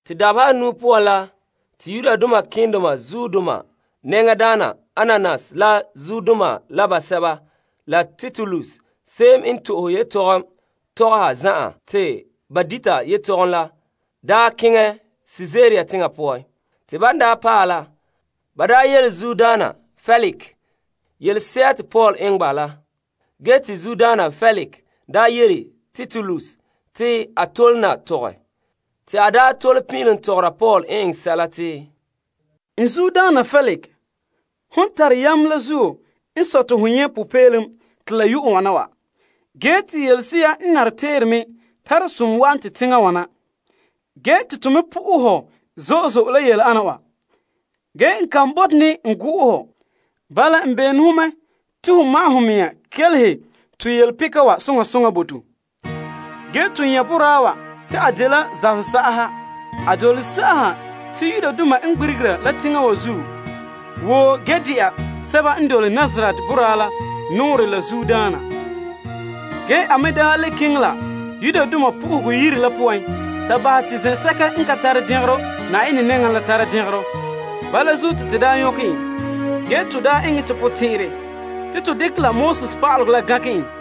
Dabeha anuu poan la te malema nɛŋadaana Ananias la zuodoma basɛba la Tertulus n de to'ohe yetɔgom tɔgɔhaba ayema daa keŋɛ Kaesarea teŋa poan. Ban paɛ la, ba yele teŋbehera yelese'a te ba yeti Paul eŋɛ la. Ge te Feliks yele Tertulus te a tole na tɔgɛ. Te a tole pin'ilom tɔgɔra Paul n eŋɛ sɛla te, Hon tare yam zo'e zo'e la zuo n sɔe te to nyɛ' popeelom te la yue wana wa. Ge te yelese'a n nare teere me tare som wa'an to teŋa wa na. Teŋbehera Feliks, to me po'ohɛ hɔ zo'e zo'e la yele ana wa. Ge n ka bote n go'om hɔ. Bala n bene ho mɛ te ho ma'ɛn ho mea kelehe to yelepeka wa soŋa soŋa bo to. To nyɛ' boraa wa ta a de'a la zabesagaha. A dole sagaha te Yudoma n gbirigera la teŋa wa zuo woo ge le de'a sɛba n dole Nazaret boraa la nɔɔrɛ la zuodaana. A me daa le keŋɛ la Yenɛ Yire la poan ta ba'ahɛ te zen'sɛka n ka tare dɛngerɔ Yenɛ nɛŋa la tara dɛngerɔ. Bala zuo te to daa nyɔkɛ en te to eŋɛ to potɛn'ɛrɛ te to dekɛ la pa'alegɔ la gankɛ en.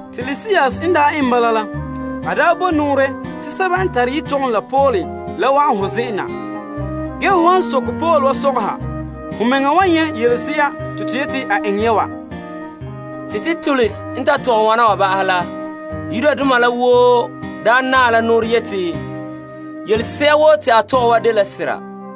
Te a daa bo nɔɔrɛ te sɛba n tare yetɔgom la Paul la wa'an ho zen'en na. Ho han soke Paul wa sɔgɔha, ho mɛŋa wan nyɛ' yelese'a te to yete a eŋɛ ya wa. Tertulus n ta tɔgɛ wana wa ba'ahɛ la, Yudoma la woo naa la nɔɔrɛ yete yelese'a woo te a tɔgɛ wa dela sera.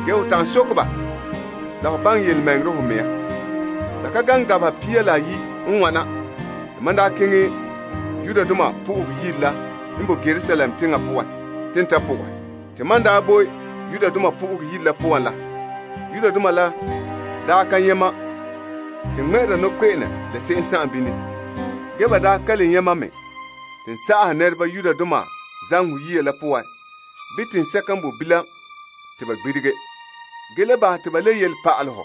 Ho ta'an soke baŋɛ yelemɛŋɛrɛ ho mea. La ka gaŋɛ dabeha pia la ayi' n wana te mam daa keŋɛ Yenɛ Yire la n bo Yerusalem teŋa poan te n ta po'ohɛ. Te mam daa bo Yenɛ Yire la poan la, Yudoma la daa ka nyɛ' mam te n ŋmɛ'ɛre nɔkpe'ene la se'em bini. Ba daa ka le nyɛ' mam mɛ te n sagahe zamehegɔ yiya la poan bii teŋsɛka n bo bilam te ba gbirige, ge le bahɛ te ba le yele pa'alɛ ho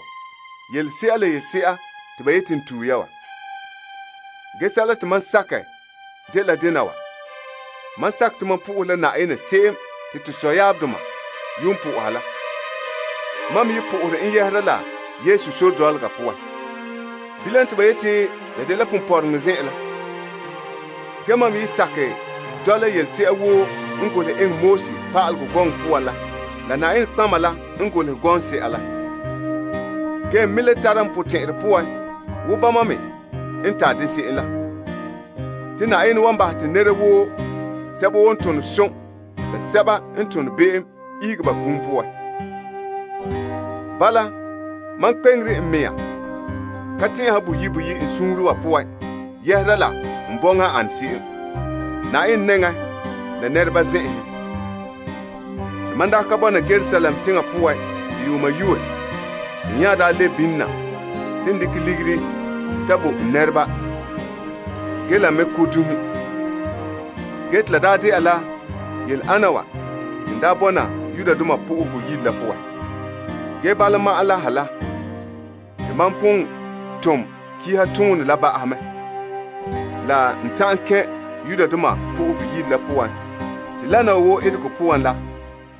yelese'a la yelese'a te ba yete n tue ya wa. Ge sɛla te mam sakɛ dela dena wa. Mam sakɛ te mam po'ohere la Yenɛ se'em te to sɔyaabdoma yuun po'oha la. Mam me dole Sore dɔlɔga poan te ba yete la dagɛ yelemɛŋɛrɛ dɔlɔga la. Ge mam me dɔla yelese'a woo n boe Pa'alegɔ la Nɔtɔgɔheba gɔŋse'a la. Ge n me le tara n potɛn'ɛrɛ poan wo bama me n tare de se'em la, te Yenɛ wan bahɛ te nɛra woo, sɛba n tone som la sɛba n tone be'em ihege ba kum poan. Bala, mam kpeŋere n mea ka tɛn'ɛha boyi' boyi' n suunre wa poan yɛhera la n bɔŋa n ane se'em Yenɛ nɛŋa la nɛreba zen'enhen. Mam daa ka bɔna Yerusalem teŋa poan te yuuma yue, te n nya daa lebe bini na te n dekɛ ligiri ta bo n nɛreba ge la n me ko' dunhe kaanbegɔ. Te la daa de'a la yele ana wa te n daa bɔna Yenɛ Yire la poan. Bala ma'an la ha la te mam pon tom malema toonɛ la ba'ahɛ mɛ, la n ta'an kɛn' Yenɛ Yire la poan ba'ahɛ mɛ. Lana wa woo etegɔ poan la,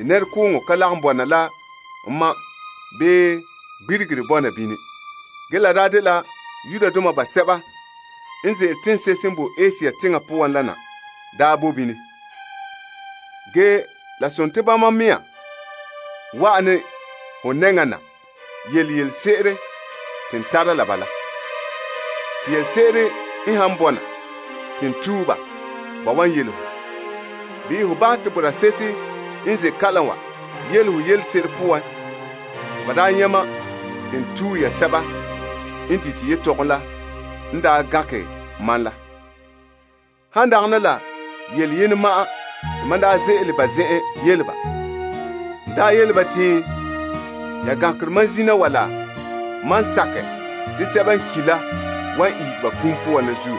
nɛrekooŋɔ ka lagom bɔna la ma bii gbirigere bɔna bini. Ge la dela Yudoma basɛba n ze'ele teŋse'ehe n bo Asia teŋa poan la n daa bo bini. Ge la sontii bama mea wa'an ne ho nɛŋa na yele yelese'ere te n tara la ba la, te yelese'ere n han bɔna te n tue ba, ba wan yele ho. Bii ho bahɛ te boraa se'ehe n ze' kalam wa yele ho yelese'ere poan te ba daa nyɛ' mam te n tue ya te sɛba n dite yetɔgom la n daa gankɛ ma la. Han dagana la yele yenɛ ma'an te mam daa ze'ele ba zen'en yele ba. N daa yele ba te, Ya gankere ma zina wa la mam sakɛ te sɛba n ki' la wan ihege ba kum poan la zuo.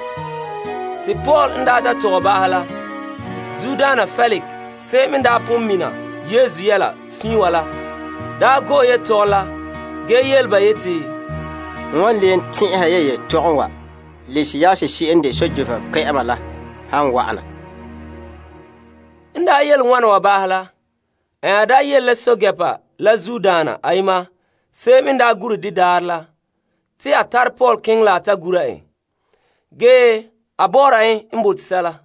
Paul n ta tɔgɛ ba'ahɛ la, Feliks se'em n daa pon mina Sore dɔlɔga fiin wa daa go'ɛ yetɔgom la ge yele ba yeti, N wan leen tɛn'ɛhɛ ya yetɔgom wa Lisias se'em n de pɛɛntɛɛnreba kpɛ'ɛma la han wa'an na. En yele wana wa ba'ahɛ la, a nya yele la pɛɛntɛɛnreba la zuodaana ayema se'em n daa gure de daarɛ la, te a tare Paul keŋɛ la a ta gura en, ge te a bahɛ te a taaba bɔ'ɔra en n bote sɛla.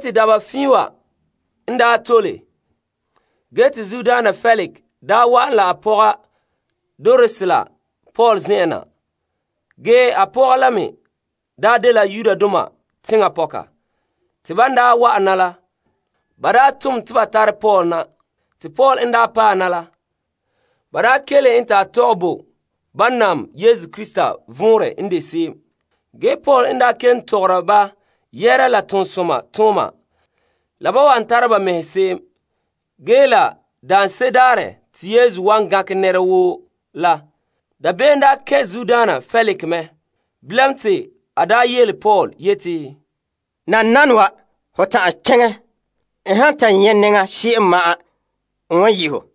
Dabeha fiin wa n tole ge te Feliks daa wa'an la a pɔga Drusila. Pɔka la me daa dela Yudoma teŋa pɔka. Ba tom te ba tare Paul na te Paul n daa paɛ na la, ba kelehe en ta a tɔgɛ bo ba nam Yesu Krista vɔnrɛ n de se'em. Paul n kelom tɔgɔra ba yɛhera la tontɔɔtooma la ba wan tare ba mɛhe se'em la daarɛ te Yesu wan gankɛ nɛra woo la, dabeem kɛn' Feliks mɛ. Bilam te a yele Paul yeti, Nananawa, ho ta'an keŋɛ. N wan ta nyɛ' nɛŋa se'em ma'an n wan yi' ho.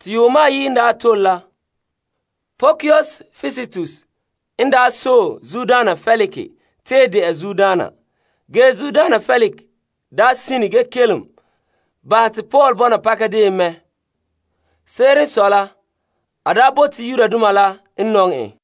Yuuma ayi' n tole la, Porsius Festus n sɔe Feliks tee de'a teŋbehera. Ge Feliks sine ge kelom bahɛ te Paul bɔna pakadeen mɛ. Se'ere n sɔe la, a bote Yudoma la n nɔŋɛ en.